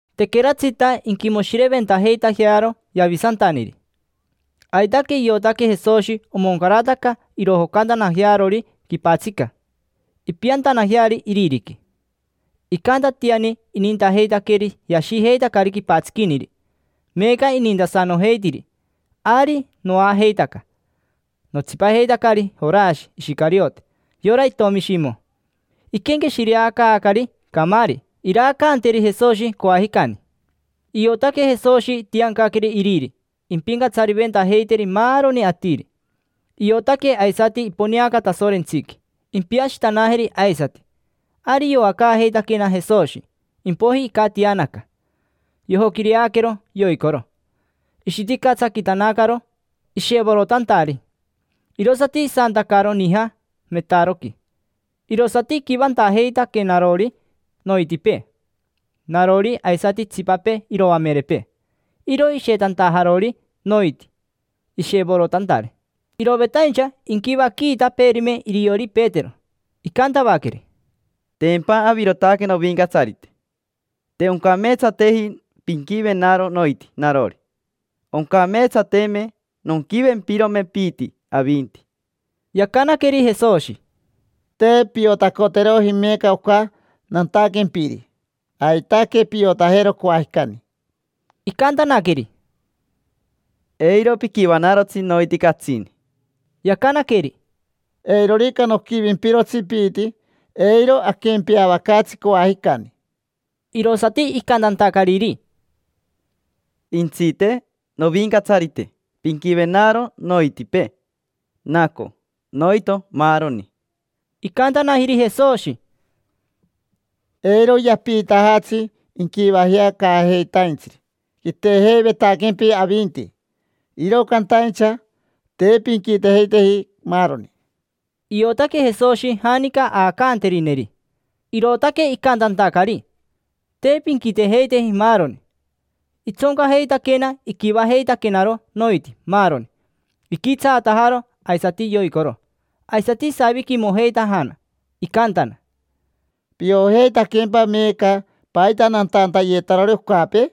Tequeratsita inquimoshireventajeitajearo Yavisantaniri. Aitaque iotaque Jesoshi omoncarataca irojocantanajearori quipatsica, impiantanajeari iririqui. Icantatiani inintajeitaqueri yashijeitacari quipatsiquiniri. Meeca inintasanojeitiri. Ari noajeitaca, notsipajeitacari Jorashi Ishicariote, yora itomi Shimo. Iquenqueshireacaacari camaari iraacanteri Jesoshi coajicani. Iotaque Jesoshi itiancaqueri Iriri impincatsariventajeiteri maaroni atiri. Iotaque aisati iponeaca Tasorentsiqui, impiashitanajeri aisati. Ari yoacaajeitaquena Jesoshi, impoiji icatianaca. Yojoquireaquero yoicoro. Ishiticatsaquitanacaro ishevorotantari. Irosati isantacaro nija metaroqui, irosati iquivantajeitaquenarori noitipee: narori, aisati itsipapee iroamerepee. Iro ishetantajanarori noiti ishevorotantari. Irovetaincha inquivaquiitapeerime iriori Petero, icantavaqueri: —Tempa avirotaque Novincatsarite, te oncameetsateji pinquivenaro noiti narori. Oncameetsateme nonquivempirome piiti avinti. Yacanaqueri Jesoshi: —Te piotacoteroji meeca oca nantaquempiri. Aitaque piotajero coajicani. Icantanaqueri: —Eiro piquivanarotsi noiti catsini. Yacanaqueri: —Eirorica noquivimpirotsi piiti, eiro aquempeavacaatsi coajicani. Irosati icantantacariri: —Jentsite, Novincatsarite, pinquivenaro noitipee, naco, noito, maaroni. Icantanajiri Jesoshi: —Eiro yapiitajatsi inquivajea caajeitaintsiri. Quitejeivetaquempi avinti, iro cantaincha te pinquitejeiteji maaroni. Iotaque Jesoshi janica aacanterineri. Irootaque icantantacari: “Te pinquitejeiteji maaroni”. Itsoncajeitaquena iquivajeitaquenaro noiti maaroni. Iquitsaatajaro aisati yoicoro. Aisati isaviquimojeitajana, icantana: —¿Piojeitaquempa meeca paita nantantayetarori ocapee?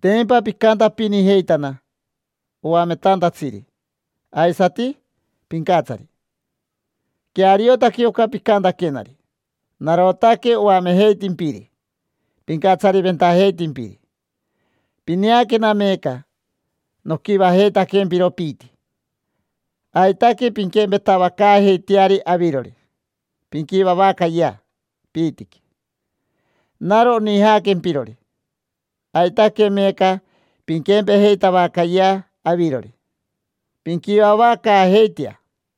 Tempa picantapinijeitana: Oametantatsiri, aisati Pincatsari. Queariotaque oca picantaquenari. Narotaque oamejeitimpiri, pincatsariventajeitimpiri. Pineaquena meeca, noquivajeitaquempiro piiti. Aitaque pinquempetavacaajeiteari avirori, pinquivavacayea piitiqui. Naro onijaaquempirori. Aitaque meeca pinquempejeitavacayea avirori, pinquivavacaajeitea.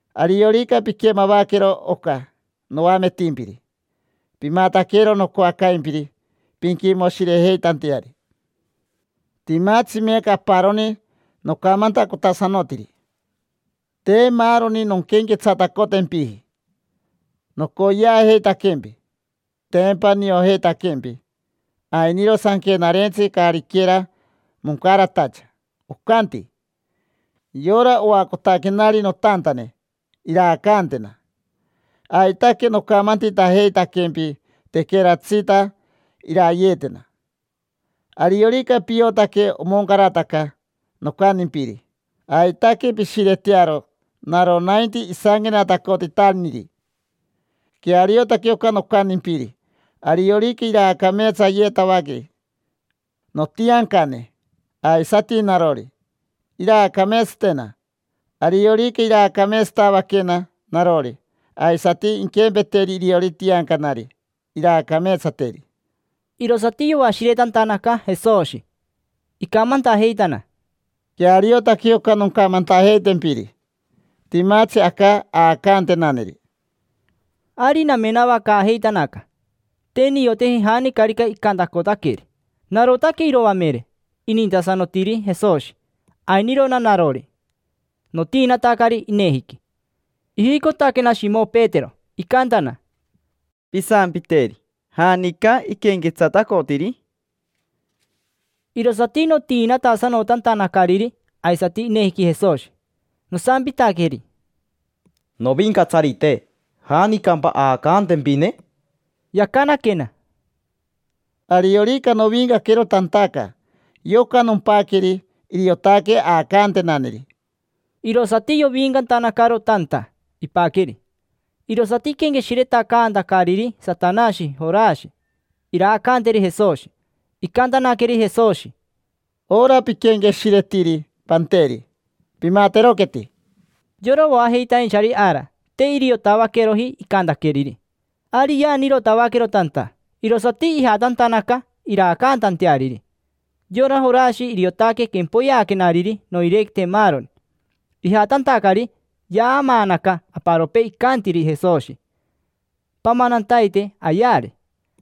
Ariorica piquemavaquero oca noametimpiri, pimataquero nocoacaimpiri pinquimoshirejeitanteari. Timatsi meeca aparoni nocamantacotasanotiri, te maaroni nonquenquetsatacotempiji. Nocoyeajeitaquempi, tempa niojeitaquempi. Ainiro Sanquenarentsi caariquera moncaratacha, ocanti: “Yora oacotaquenari notantane, iraacantena”. Aitaque nocamantitajeitaquempi tequeratsita irayeetena. Ariorica piotaque omoncarataca nocantimpiri, aitaque pishiretearo naro nainti isanquenatacotitaniri. Queariotaque oca nocantimpiri. Ariorica iraacameetsayeetavaqueri notiancane, aisati narori, iraacameetsatena. Ariorica iraacameetsatavaquena narori, aisati inquempeteri iriori tiancanari, iraacameetsateri. Irosati yoashiretantanaca Jesoshi, icamantajeitana: —Queariotaque oca noncamantajeitempiri. Timatsi aca aacantenaneri. Ari namenavacaajeitanaca, te nioteji janicarica icantacotaqueri. Narotaque iroamere inintasanotiri Jesoshi, ainirona narori, notiinatacari inejiqui. Ijicotaquena Shimo Petero, icantana: —Pisampiteri. ¿Janica iquenquetsatacotiri? Irosati notiinatasanotantanacariri aisati inejiqui Jesoshi. Nosampitaqueri: —Novincatsarite, ¿janicampa aacantempine? Yacanaquena: —Ariorica novincaquero tantaca, yoca nompaqueri, iriotaque aacantenaneri. Irosati yovincantanacaro tanta, ipaqueri. Irosati iquenqueshiretacaantacariri Satanashi Jorashi iraacaanteri Jesoshi. Icantanaqueri Jesoshi: —Ora piquenqueshiretiri panteri, pimateroqueti. Yora oajeitainchari ara te iriotavaqueroji icantaqueriri. Ari yaanirotavaquero tanta, irosati ijatantanaca iraacaantanteariri. Yora Jorashi iriotaque quempoyeaquenariri noirequite maaroni. Ijatantacari, yaamaanaca aparopee icantiri Jesoshi: “Pamanantaite ayeari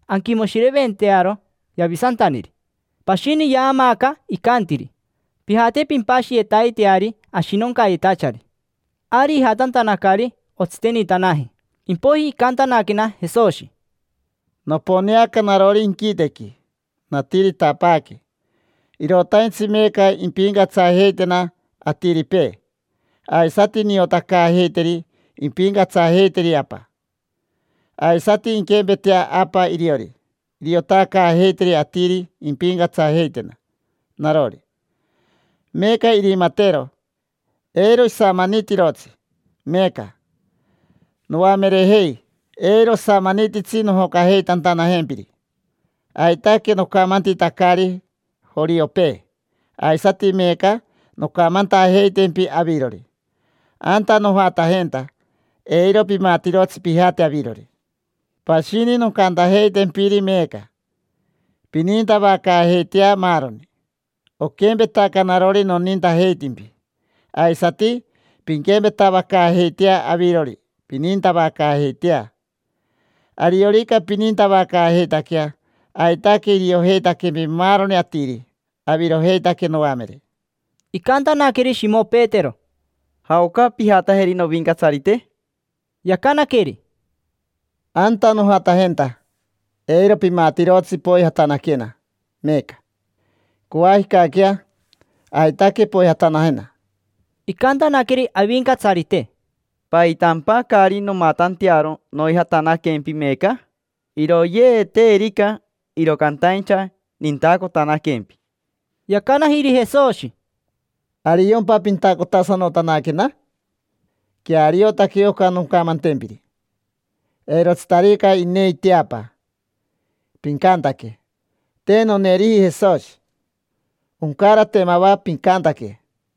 anquimoshireventearo Yavisantaniri”. Pashini yaamaaca icantiri: “Pijate pimpashiyetaiteari ashinoncayetachari”. Ari ijatantanacari, otsitenitanaji. Impoiji icantanaquena Jesoshi: —Noponeanaca narori inquitequi, natiritapaaque. Irotaintsi meeca impincatsajeitena atiripee, aisati niotacaajeiteri impincatsajeiteri Apa. Aisati inquempetea Apa iriori, iriotacaajeiteri atiri impincatsajeitena narori. Meeca irimatero, eiro isamanitirotsi. Meeca, noamerejei, eiro osamanititsi nojocajeitantanajempiri. Aitaque nocamantitacari joriopee, aisati meeca noncamantajeitempi avirori: anta nojatajenta, eiro pimatirotsi pijataje avirori. Pashini noncantajeitempiri meeca: pinintavacaajeitea maaroni. Oquempetaca narori nonintajeitimpi, aisati pinquempetavacaajeitea avirori, pinintavacaajeitea. Ariorica pinintavacaajeitaquea, aitaque iriojeitaquempi maaroni atiri: avirojeitaque noamere. Icantanaqueri Shimo Petero: —¿Jaoca pijatajeri, Novincatsarite? Yacanaqueri: —Anta nojatajenta, eiro pimatirotsi poijatanaquena meeca. Coajicaquea aitaque poijatanajena. Icantanaqueri Avincatsarite: —¿Paitampa caari nomatantearo noijatanaquempi meeca? Iroyeeteerica, iro cantaincha nintacotanaquempi. Yacanajiri Jesoshi: —¿Ariompa pintacotasanotanaquena? Queariotaque oca noncamantempiri: eirotsitarica inei teapa, pincantaque: “Te noneeriji Jesoshi”. Oncarate mava pincantaque.